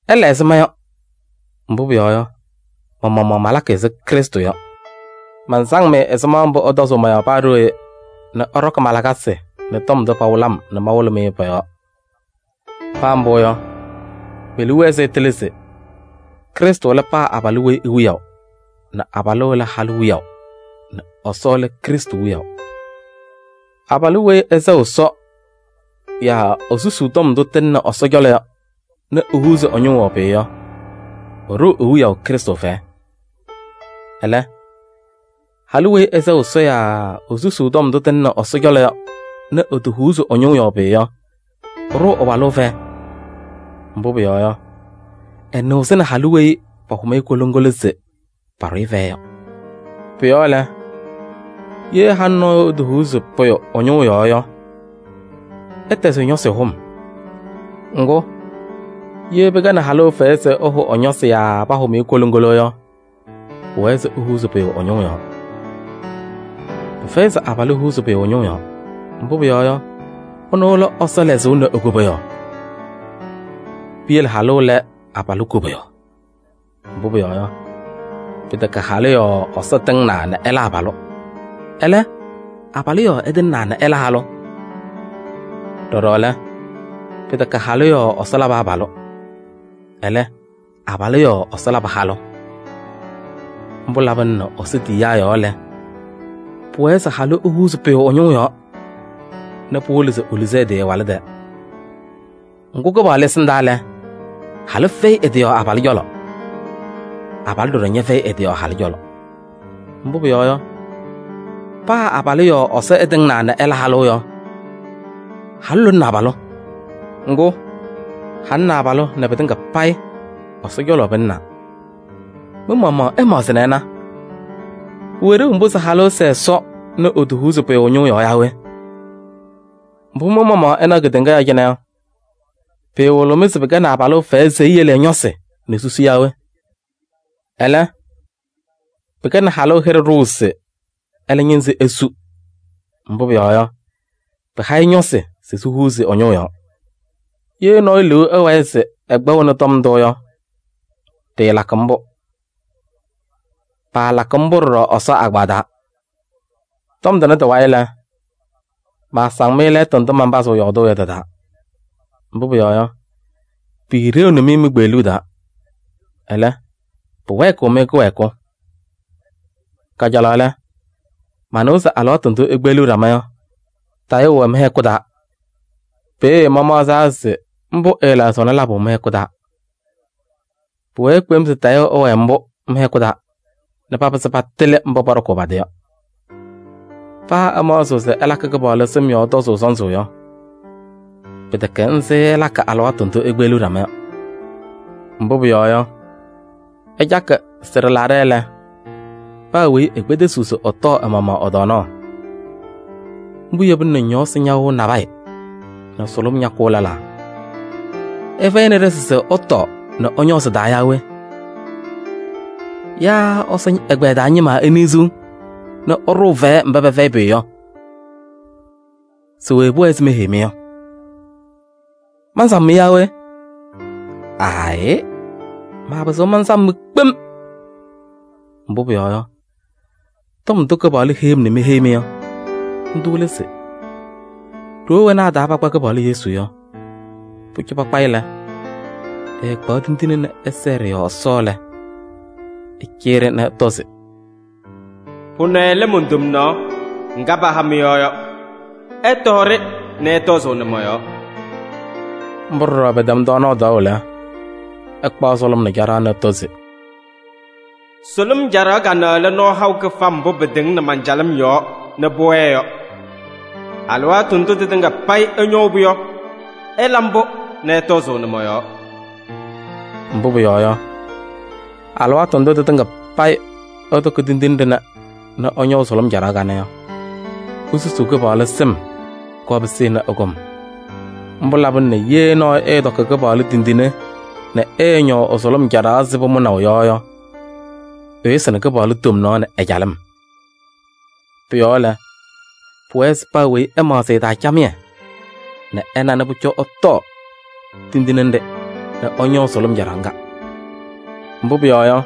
Ɩla ɛzɩ ma yɔ, mbʋ pʋyɔɔ yɔ, ma-maɣmaɣ malakɩ ɛzɩ Krɩstʋ yɔ. Mansaŋ-mɩ ɛzɩma mbʋ ɩtɔzʋʋ mɔ-yɔɔ paa ɖooye nɛ ɩɖɔkɩ ma-lakasɩ nɛ tɔm ndʋ pawɩlɩ-m nɛ mawɩlɩ-mɩ yɔ, pɔ-yɔɔ. Paa mbʋ yɔ, me-liu wɛɛ se ɩtɩlɩ se: Krɩstʋ lɛ paa abalʋ weyi e-wiyaʋ nɛ abalʋ lɛ halʋ wiyaʋ nɛ Ɛsɔ lɛ Krɩstʋ wiyaʋ. Abalʋ weyi ɛsɛɣ Ɛsɔ yaa esusuu tɔm ndʋ tɩlɩnɩ Ɛsɔ cɔlɔ yɔ ehuuzi ɛ-ñʋʋ yɔɔ pʋyʋ yɔ, ɛɖʋʋ e-wiyaʋ Krɩstʋ fɛyɛ. Ɛlɛ, halʋ weyi ɛsɛɣ Ɛsɔ yaa esusuu tɔm ndʋ tɩlɩnɩ Ɛsɔ cɔlɔ yɔ nɛ etohuuzi ɛ-ñʋʋ yɔɔ pʋyʋ yɔ, ɛɖʋʋ ɛ-walʋ fɛyɛ. Mbʋ pʋyɔɔ yɔ, ɛnɩɣzɩnɩ halʋ weyi pahʋm-ɩ koloŋgolo se paɖʋ-ɩ fɛyɛ yɔ. Pʋ-yɔɔ lɛ, ye halʋ nɔɔyʋ etohuuzi pʋyʋ ɛ-ñʋʋ yɔɔ yɔ, ɛtɛzɩ ɛ-ñɔsɩ hʋm. Ŋgʋ, ye pɩkɛnɩ halʋ fɛyɛ se ɛhʋ ɛ-ñɔsɩ yaa pahʋm-ɩ koloŋgolo yɔ, pʋwɛɛ se ehuuzi pʋyʋ ɛ-ñʋʋ yɔɔ. Pɩfɛyɩ se abalʋ ehuuzi pʋyʋ ɛ-ñʋʋ yɔɔ. Mbʋ pʋyɔɔ yɔ, ɛnʋ lɛ Ɛsɔ lɛzʋʋ nɛ e-koboyaɣ. Piyele halʋ lɛ abalʋ koboyaɣ. Mbʋ pʋyɔɔ yɔ, pɩtɛkɛ halʋ yɔɔ Ɛsɔ tɩŋnaa nɛ ɛla abalʋ. Ɛlɛ, abalʋ yɔɔ ɛtɩŋnaa nɛ ɛla halʋ. Ɖɔɖɔ lɛ, pɩtɛkɛ halʋ yɔɔ Ɛsɔ labɩ abalʋ, ɛlɛ, abalʋ yɔɔ ɛlabɩ halʋ. Mbʋ labɩna nɛ Ɛsɔ tiyiyaa yɔɔ lɛ, pʋwɛɛ se halʋ ehuuzi pʋyʋ ɛ-ñʋʋ yɔɔ nɛ pɩwɩlɩ se eluzi ɛ-tɩ ɛ-walʋ tɛɛ. Ŋgʋ Kɩpaɣlʋ ɛsɩndaa lɛ, halʋ fɛyɩ ɛ-tɩ yɔɔ abalʋ cɔlɔ. Abalʋ ɖɔɖɔ ñɛfɛyɩ ɛ-tɩ yɔɔ halʋ cɔlɔ. Mbʋ pʋyɔɔ yɔ, paa abalʋ yɔɔ Ɛsɔ ɛtɩŋnaa nɛ ɛla halʋ yɔ, halʋ lʋlʋʋnɩ abalʋ. Ŋgʋ, halʋ nɛ abalʋ nɛ pɩtɩŋa payɩ Ɛsɔ cɔlɔ pɩlɩnaa. Mɩ-maɣmaɣ ɩmaɣzɩ nɛ ɩna: pʋwɛ ɖeu mbʋ se halʋ ɛsɛɛ Ɛsɔ nɛ etohuuzi pʋyʋ ɛ-ñʋʋ yɔɔ yaa we? Mbʋ mɩ-maɣmaɣ ɩnaɣ kedeŋa yɔɔ cɩnɛ yɔ, pɩɩwɩlɩɣ-mɩ se pɩkɛnɩ abalʋ fɛyɛ se eyele ɛ-ñɔsɩ nɛ susu yaa we? Ɛlɛ, pɩkɛnɩ halʋ hɩɖɛ ɖʋʋ se ɛlɛ ñɩnzɩ esu. Mbʋ pʋyɔɔ yɔ, pɩha-ɩ ñɔsɩ se sihuuzi ɛ-ñʋʋ yɔɔ. Ye nɔɔyʋ liu ɛwɛɛ se ɛkpɛɣnɩ tɔm ndʋ yɔ, ɖɩɩlakɩ mbʋ. Paalakɩ mbʋ ɖɔɖɔ Ɛsɔ agbaa taa. Tɔm tʋnɛ tɩ-wayɩ lɛ, maasaŋ-mɩ lɛɛtʋ ndʋ manpazɩɣ yɔɔdʋʋ yɔ tɩ-taa. Mbʋ pʋyɔɔ yɔ, piiɖeɣni-mɩ mi-kpeɣluu taa. Ɛlɛ, pʋwɛɛkɩɣ-mɩ kɩwɛɛkʋ. Kajalaɣ lɛ, manɩwa se alɩwaatʋ ndʋ ikpeɣliɣ ɖama yɔ, tayʋʋ wɛ mɩ-hɛkʋ taa. Peeye mamaɣzaa se mbʋ ɛɛlaɣzɩɣnɩ labʋ mɩ-hɛkʋ taa. Pʋwɛɛ kpem se tayʋʋ ɛwɛɛ mbʋ mɩ-hɛkʋ taa nɛ papɩzɩ patɩlɩ mba pɔɖɔkʋʋ pa-tɩ yɔ. Paa ɩmaɣzɩɣ se ɩlakɩ Kɩpaɣlʋ sɩm yɔɔ tɔzʋʋ sɔnzɩ yɔ, pɩtɛkɛ nzɩ ɩlakɩ alɩwaatʋ ndʋ ikpeɣliɣ ɖama yɔ. Mbʋ pʋyɔɔ yɔ, ɩcakɩ sɩ-ɖɩlaɖɛ lɛ, paa weyi ekpedesiɣ se ɛtɔɔ ɛ-maɣmaɣ ɛ-tɔɔnaɣ. Mbʋ yebina nɛ ñɔɔsɩ ñawɩɣ nabɛyɛ nɛ sʋlʋm ñakʋʋ lɛlaa. Ɩfɛyɩnɩ ɖɩsɩ se ɩtɔɔ nɛ ɩñɔɔ sɩ-taa yaa we? Yaa Ɛsɔ ɛgbɛyɛ taa ñɩma iniɣziɣ nɛ ɩɖʋʋ fɛyɛ mba pɛfɛyɩ pʋyʋ yɔ? Se we pʋwɛɛ se meheyi-mɩ yɔ? Mansam-mɩ yaa we? Aayɩ, maapɩzɩɣ mansam-mɩ kpem. Mbʋ pʋyɔɔ yɔ, tɔm ndʋ Kɩpaɣlʋ heyi-m nɛ meheyi-mɩ yɔ, ndʋ lɛ se: ɖoo wena a-taa pakpa Kɩpaɣlʋ Yesu yɔ, pʋcɔ pakpa-ɩ lɛ, ɛɛkpaɣ tindine nɛ ɛsɛɛ ɖɩ-yɔɔ Ɛsɔ lɛ, ɛcɩyɩ-ɖɩ nɛ ɛtɔ se: “Pʋnɛ lɛ mon-tomnaɣ ŋga paha mɩ-yɔɔ yɔ. Ɩtɔɔ-ɖɩ nɛ ɩtɔzʋʋnɩ mɔ-yɔɔ.” Mbʋ ɖɔɖɔ pɛtɛm tɔɔnaɣ tɔɔʋ lɛ, ɛkpaɣ sʋlʋm nɛ caɖaɣ nɛ ɛtɔ se: “Sʋlʋm caɖaɣ kanɛ lɛ nɔɔ haʋ kɩfam mbʋ pɩtɩŋnɩ man-calɩm yɔɔ nɛ pʋwɛɛ yɔ. Alɩwaatʋ ndʋ tɩtɩŋa payɩ ɩñɔʋ-pʋ yɔ, ɩla mbʋ nɛ ɩtɔzʋʋnɩ mɔ-yɔɔ.” Mbʋ pʋyɔɔ yɔ, alɩwaatʋ ndʋ tɩtɩŋa payɩ ɩtɔkɩ tindine ɖɩnɛ nɛ ɩñɔʋ sʋlʋm caɖaɣ kanɛ yɔ, isusuu Kɩpaɣlʋ sɩm nɛ pʋkɔɔ pɩsɩnɩ ɛ-kɔm. Mbʋ labɩna nɛ ye nɔɔyʋ ɛɛtɔkɩ Kɩpaɣlʋ tindine nɛ ɛɛñɔʋ ɛ-sʋlʋm caɖaɣ ɛzɩ pʋmʋnaʋ yɔ yɔ, ɛyʋsɩnɩ Kɩpaɣlʋ tomnaɣ nɛ ɛ-calɩm. Pʋ-yɔɔ lɛ, pʋwɛɛ se paa weyi ɛmaɣzɩ ɛ-taa camɩyɛ nɛ ɛna nɛ pʋcɔ ɛtɔɔ tindine nɖɩ nɛ ɛñɔɔ sʋlʋm caɖaɣ ŋga. Mbʋ pʋyɔɔ yɔ,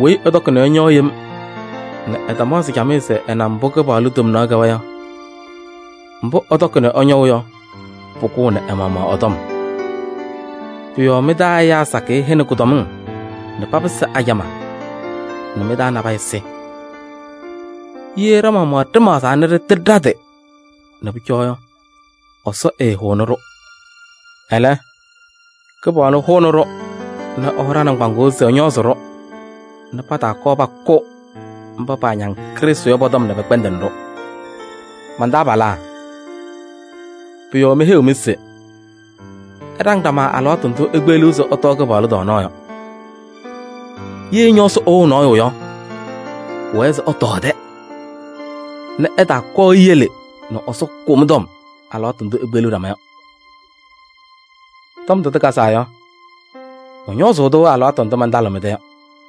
weyi ɛtɔkɩ nɛ ɛñɔɔ yem nɛ ɛtamaɣzɩ camɩyɛ se ɛna mbʋ Kɩpaɣlʋ tomnaɣ kɛwa yɔ, mbʋ ɛtɔkɩ nɛ ɛñɔʋ yɔ, pʋkʋʋnɩ ɛ-maɣmaɣ ɛ-tɔm. Pʋ-yɔɔ mɩ-taa ɛyaa sakɩyɛ hɛnɩ kʋdɔmɩŋ nɛ papɩsɩ ajamaa nɛ mɩ-taa nabɛyɛ sɩ. Ye ɖa-maɣmaɣ ɖɩmaɣzaa nɛ ɖɩtɩlɩ ɖa-tɩ nɛ pʋcɔ yɔ, Ɛsɔ ɛɛhʋʋnɩ-ɖʋ. Ɛlɛ, Kɩpaɣlʋ hʋʋnɩ-ɖʋ nɛ ɛhɔŋ ɖa-nɩŋgbaŋʋʋ se ɛñɔɔzɩ-ɖʋ nɛ pataakɔɔ pakʋ mba paañaŋ Krɩstʋ yɔ pɔ-tɔm nɛ pɩkpɛndɩnɩ-ɖʋ. Man-taabalaa, pʋ-yɔɔ meheyiɣ-mɩ se: ɩɖaŋ ɖama alɩwaatʋ ndʋ ikpeɣliɣ se ɩtɔɔ Kɩpaɣlʋ tɔɔnaɣ yɔ. Ye ñɔɔsɩ ɛwɩɣ nɔɔyʋ yɔ, pʋwɛɛ se ɛtɔɔ ɛ-tɛ nɛ ɛtaakɔɔ eyele nɛ Ɛsɔ kʋ mɩ-tɔm alɩwaatʋ ndʋ ikpeɣliɣ ɖama yɔ. Tɔm ndʋ tɩkazaa yɔ, mɔñɔɔzʋʋ-tʋ alɩwaatʋ ndʋ mantalɩɣ mɩ-tɛ yɔ.